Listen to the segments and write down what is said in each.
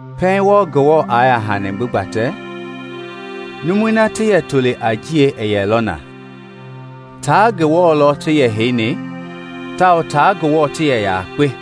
Pɛiŋ wɔɔ Ngewɔ i yaa hani gbi gbatɛ, numui na ti yɛ toli a Njiɛi i yɛ na lɔ. Tia Ngewɔ lɔ ti yɛ heini tawao tia Ngewɔ ti yɛ yakpe.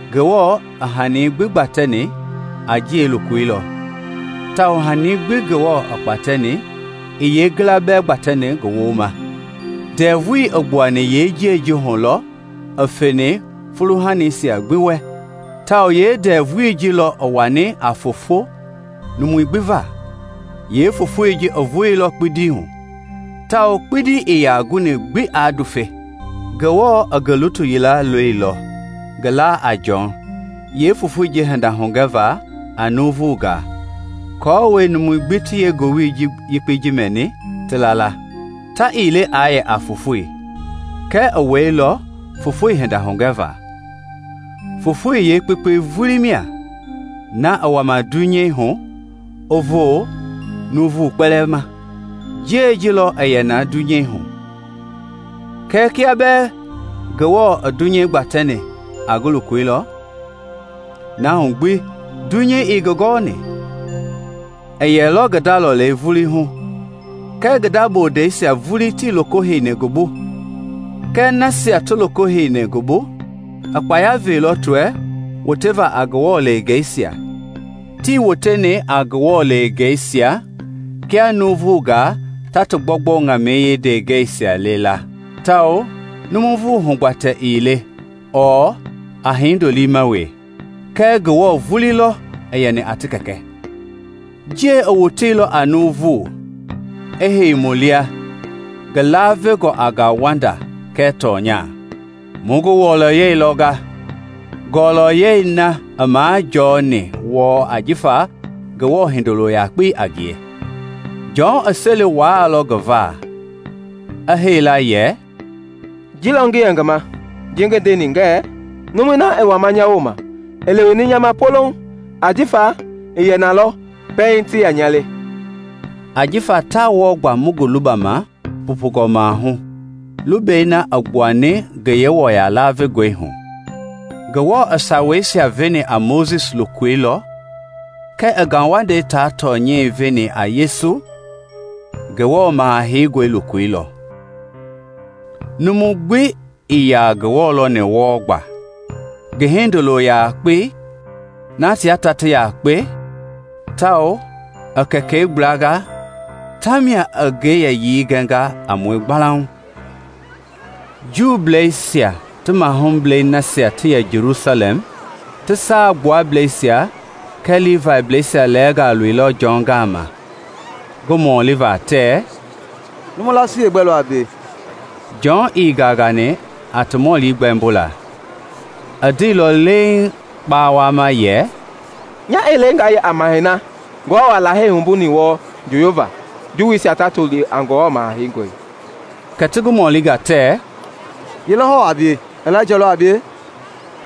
Ngewɔ i hanii gbi gbatɛni a Njiɛi loko lɔ, tawao hanii gbi Ngewɔ i kpatɛni yeengila bɛɛ ii gbatɛni ngi wooma. Ndɛvui i gbuani yee-Njiɛi hu lɔ i veni fuuhani gbi wɛ tawao yeendɛvui ji lɔ i wani a foofo nuuvu va. Yeefofoi a voolɔ kpindi hu tawao kpindi ii yaa guni aa ndufe. Ngewɔ i ngi lutu yila loilɔ, ngi laa a Jɔn, yeefofoi hinda hugɛva a nuuvungaa, aako numui gbi ti yeengowili yekpei mɛni, ti la la. Ta ii le aa yɛ a yeefofoi, kɛɛ i wɛilɔ fofoi hinda hugɛva. Fofoi yeekpekpei vulii mia, na a wa dunyei hu i voo nuuvu kpɛlɛɛ ma. Njiɛi ji i yɛlɔ dunyei hu, kɛɛ kia bɛɛ Ngewɔ i dunyei gbatɛni a ngi loko lɔ, na hu gbi dunyei ii ngi gɔni. I wɛilɔ ngi nda lɔlei vulii hu, kɛɛ ngi nda bondeisia vulii tii loko heini ngi bu. Kɛɛ nasia gbi ti loko heini ngi bu, i kpaya veilɔ ti wɛ wotevaa a Ngewɔ leengeisia. Tii woteni a Ngewɔ leengeisia kia nuuvunga ta ti gbɔugbɔu ŋamɛi yeendeengɛisia le la, tawao a nuuvu hugbatɛ ii le ɔɔ aa hindo liima hu we, kɛɛ Ngewɔ vulii lɔ i yɛni a ti Kɛkɛ. Njiɛi i woteilɔ a nuuvu, i hei mu lia, ngi lavengɔ a ngauwanda kɛɛ tɔnya. Mu ngi wɔlɔyei lɔnga, ngɔlɔyɛi na i majɔɔni wɔɔ jifa Kɛkɛi Hindolo yakpei a ngie. (Jɔn i seli wuailɔ ngi va, a hee la yɛ, “Ji lɔ ngi yɛ ngi ma ji ngi ndeni ngɛɛ, ‘Numui na i wama nya wooma i leweni nya ma polouŋ ajifa i yɛ na lɔ pɛiŋ ti yaa nya le.’”) ajifa taa wɔɔ gba mu gbi lubama pupungɔ maahu a lubɛi na a gbua ngi Yewɔya lavengɔi hu. Ngewɔ i Saweisia veni a Mojisi loko lɔ kɛɛ i ngauwandei tia tɔnyɛi veni a Yesu, Ngewɔ Maha Heingɔi, loko lɔ. Numu gbi ii yaa Ngewɔ lɔni wɔɔ gba; ngi Hindolo yakpei na tia ta ti yaakpe tawao i kɛkɛi gblanga tamia i ngi yɛyii gɛnga a mue gbalauŋ. Juuisia ti mahublɛi nasia ti yɛ Jelusalɛm ti Saa Gbuablɛisia kɛɛ Livaiblɛisia lɛɛnga loilɔ Jɔn gama ngi mɔliva tɛɛ, “Numu laasii yeegbɛ lɔ a bie?” Jɔn ii gangani a ti mɔli gbɛmbolaa; i ndeilɔ leeŋ kpawama yɛ, “Nya ii le nga yɛ a Mahɛi na Ngewɔ i Lahei wumbuni wɔɔ njooyovaa, Juuisia ta toli a Ngewɔ Maha Heingɔi.” Kɛ ti ngi mɔlinga tɛɛ, “Ye lɔ hɔɔ a bie? Ilaija lɔ a bie?”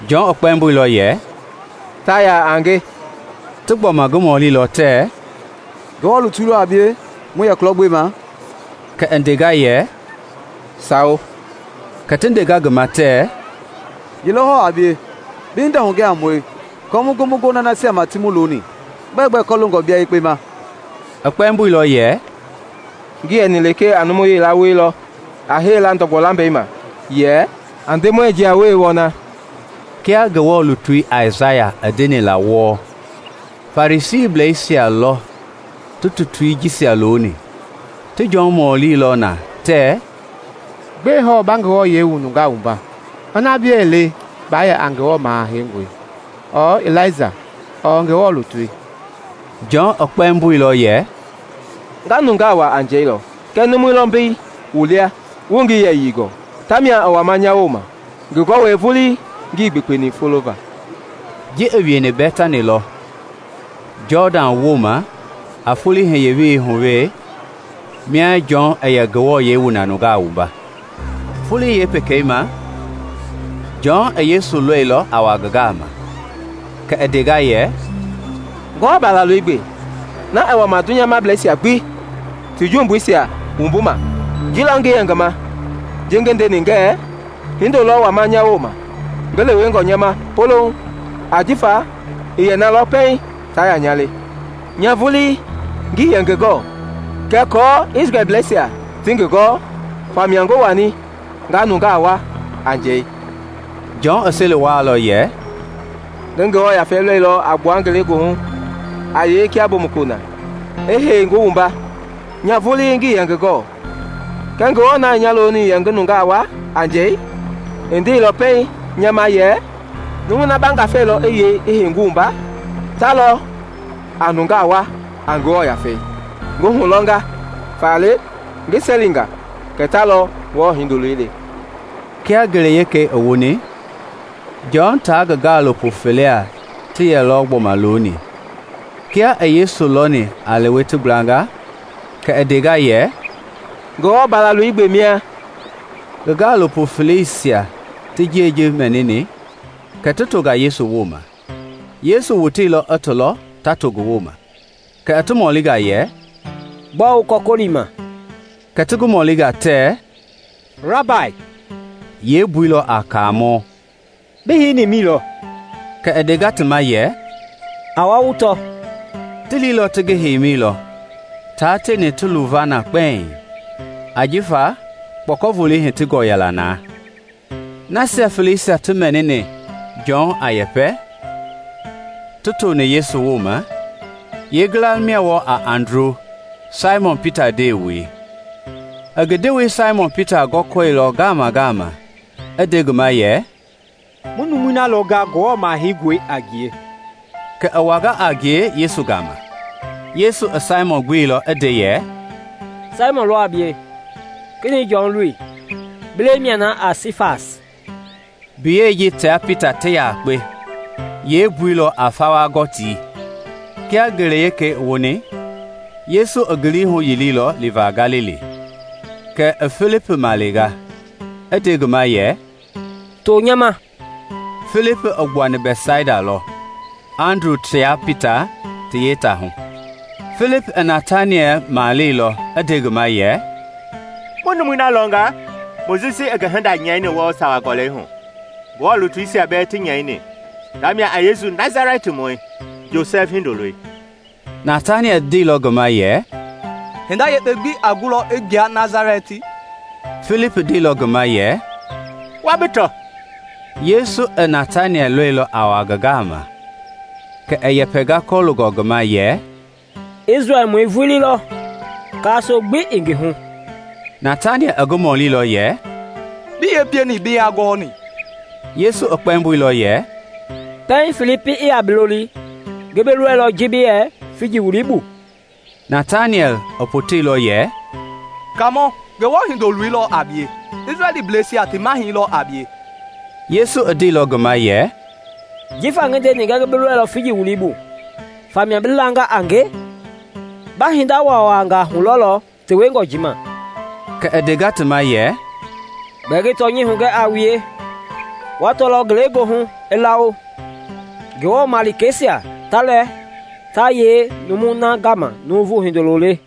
Jɔn kpɛmboilɔ yɛ, “Ta yaa a nge.” Ti gbɔma ngi mɔlilɔ tɛɛ, “Ngewɔ lutui lɔ a bie mu yɛ kulɔ gbema?” Kɛ i ndenga yɛ, “Sawo.” Kɛ ti ndenga na ngi ma tɛɛ, “Ye lɔ hɔɔ a bie? Bi hinda hugɛ a mue aako mu gu mu gona nasia ma ti mu loni. Bɛɛ gbɛ kɔloongɔ bia yekpe ma?” I kpɛmboilɔ yɛ, “Ngi yɛni lekee a numu yila woi lɔ a hee la ndɔgbɔ lambɛi ma yɛ, ‘A Ndemɔi jia-welei wɔna,’” kia Ngewɔ lutui Aisaya i ndeni la wɔɔ. Farisiisia lɔ ti tutui jisia loni. Ti Jɔn mɔlilɔ na tɛɛ, “Gbɛe hɔɔ ba nungaa wua, ina bia ii le baa yɛ a Ngewɔ Maha Heingoi, ɔɔ Ilaija ɔɔ Ngewɔ lutui?” Jɔn i kpɛmboilɔ yɛ, “Nga nungaa wua a njɛi lɔ; kɛɛ numu lɔ mbei wu lia wuii ngi yɛyii gɔɔ; tamia i wama nya wooma, ngi gɔwɛi vulii ngii gbekpeni fulova.” Ji i wieni Bɛtani lɔ, Jɔdan wooma a foloi hiye-welei hu wee, mia Jɔn i yɛ nungaa wua na. Folo wekei ma Jɔn i Yesu lɔilɔ a wa ngi gama, kɛ i ndenga yɛ, “Ngewɔ Balaloi gbe, na i wama dunyamableisia gbi ti jumbuisia wumbuma! Ji lɔ ngi yɛ ngi ma ji ngi ndeni ngɛɛ, ‘Hindo lɔ wama nya wooma ngi lewengɔ nya ma polouŋ, ajifa i yɛ na lɔ pɛiŋ ti yaa nya le.’ Nya vulii ngii yɛ ngi gɔɔ kɛɛ aako Isrɛlbleisia ti ngi gɔɔ, famia ngi wani nga nungaa wua a njɛi.” Jɔn i seli wuailɔ yɛ, “Ngi Ngewɔ Yafei lɔilɔ a gbua ngelegoohu a yei kia mbomukuloi na, i hei ngi wumba. Nya vulii ngii yɛ ngi gɔɔ; kɛɛ Ngewɔ na i nya looni yɛ ngi nungaa wua a njɛi, i ndeilɔ pɛiŋ nya ma yɛ, ‘Numui na ba Ngafei lɔ i yei i hei ngi wumba, ta lɔ a nungaa wua a Ngewɔ Yafei.’ Ngi hulɔnga, faale ngi selinga kɛ ta lɔ Ngewɔ Hindoloi le.” Kia ngele wekei i woni, Jɔn tia ngi gaalopo fele ti yɛlɔ gbɔma looni; kia i Yesu lɔni a lewe ti gblanga kɛ i ndenga yɛ, “Ngewɔ Balaloi gbe mia!” Ngi gaalopo feleisia ti ji mɛnilɔ kɛ ti tonga Yesu ma. Yesu i woteilɔ i ti lɔ ta to ngi ma kɛ i ti mɔlinga yɛ, “Gbɔɔ wu kɔkɔlima?” Kɛ ti ngi mɔlinga tɛɛ, “Rabai (yeembui lɔ a Kaamɔ), bi heini mi lɔ?” Kɛ i ndenga ti ma yɛ, “A wa wu tɔ.” Ti liilɔ ti ngi heimi lɔ, tia tieni ti luva na kpɛiŋ, jifa kpɔkɔvolei hitingɔ yɛla na. Nasia feleisia ti mɛnini Jɔn a yɛpɛ, ti toni Yesu ma, yeengila mia wɔɔ a Andru, Saimɔn Pita ndewei. I ngi ndewei Saimɔn gɔkɔlilɔ ngaama i nde ngi ma yɛ, “Mu numui na lɔnga Ngewɔ Maha Heingɔi a ngie.” Kɛ i wanga a ngie Yesu gama. Yesu i Saimɔn gbeilɔ yɛ, “Saimɔn lɔ a bie, Kenɛi Jɔn loi. Bi lɛi mia na a Sifas” (mbiyɛi ji tia Pita ti yakpe, yeembui a Fawa-Gɔtii). Kia ngele wekei i woni, Yesu i ngi lii huyiliilɔ liva Galili. Kɛ i Filipi malenga, i nde ngi ma yɛ, “To nya ma!” (Filipi i gbuani Bɛtsaida lɔ, Andru tia Pita ti yeetaahu.) Filipi i Nataniɛl maleilɔ, i nde ngi ma yɛ, “Mu numui na lɔnga Mojisi i ngi hinda nyɛini wɔɔ Sawa Gɔlɛi hu, Ngewɔ lutuisia bɛɛ ti nyɛi. Tamia a Yesu Nasalɛtimɔi, Josɛfi hindoloi.” Nataniɛl ndeilɔ ngi ma yɛ, “Hinda yekpe gbi a gulɔ i gbua Nasalɛti?” Filipi ndeilɔ ngi ma yɛ, “Wa bi tɔ.” Yesu i Nataniɛl lɔilɔ a wa ngi gama kɛ i yɛpɛnga kɔloongɔ ngi ma yɛ, “Isrɛlmɔi vulii lɔ, kaasoo gbi ii ngi hu!” Nataniɛl i ngi mɔlilɔ yɛ; “Bi yee pieni bi nya gɔni?” Yesu i kpɛmboilɔ yɛ, “Pɛiŋ Filipi i yaa bi loli, ngi bi lɔilɔ ji bi yɛ figi wulii bu.” Kɛ Nataniɛl i potenga yɛ, “Kaamɔ, Ngewɔ Hindoloi lɔ a bie! Isrɛlbleisia ti Mahɛi lɔ a bie!” Yesu i ndeilɔ ngi ma yɛ, “Jifa ngi ndeni ngɛɛ ngi bi lɔilɔ figi wulii bu faa mia bi langa a nge? Ba hinda waawangaa hulɔlɔ tewengɔ ji ma.” Kɛ i ndenga ti ma yɛ, “Gbɛɛ ngi tɔnyɛi hugɛ a wue: wa tɔlɔ ngelegoohu i lawo, Ngewɔ malikeisia ta lɛ ta yei numui na gama Nuuvu Hindoloi le.”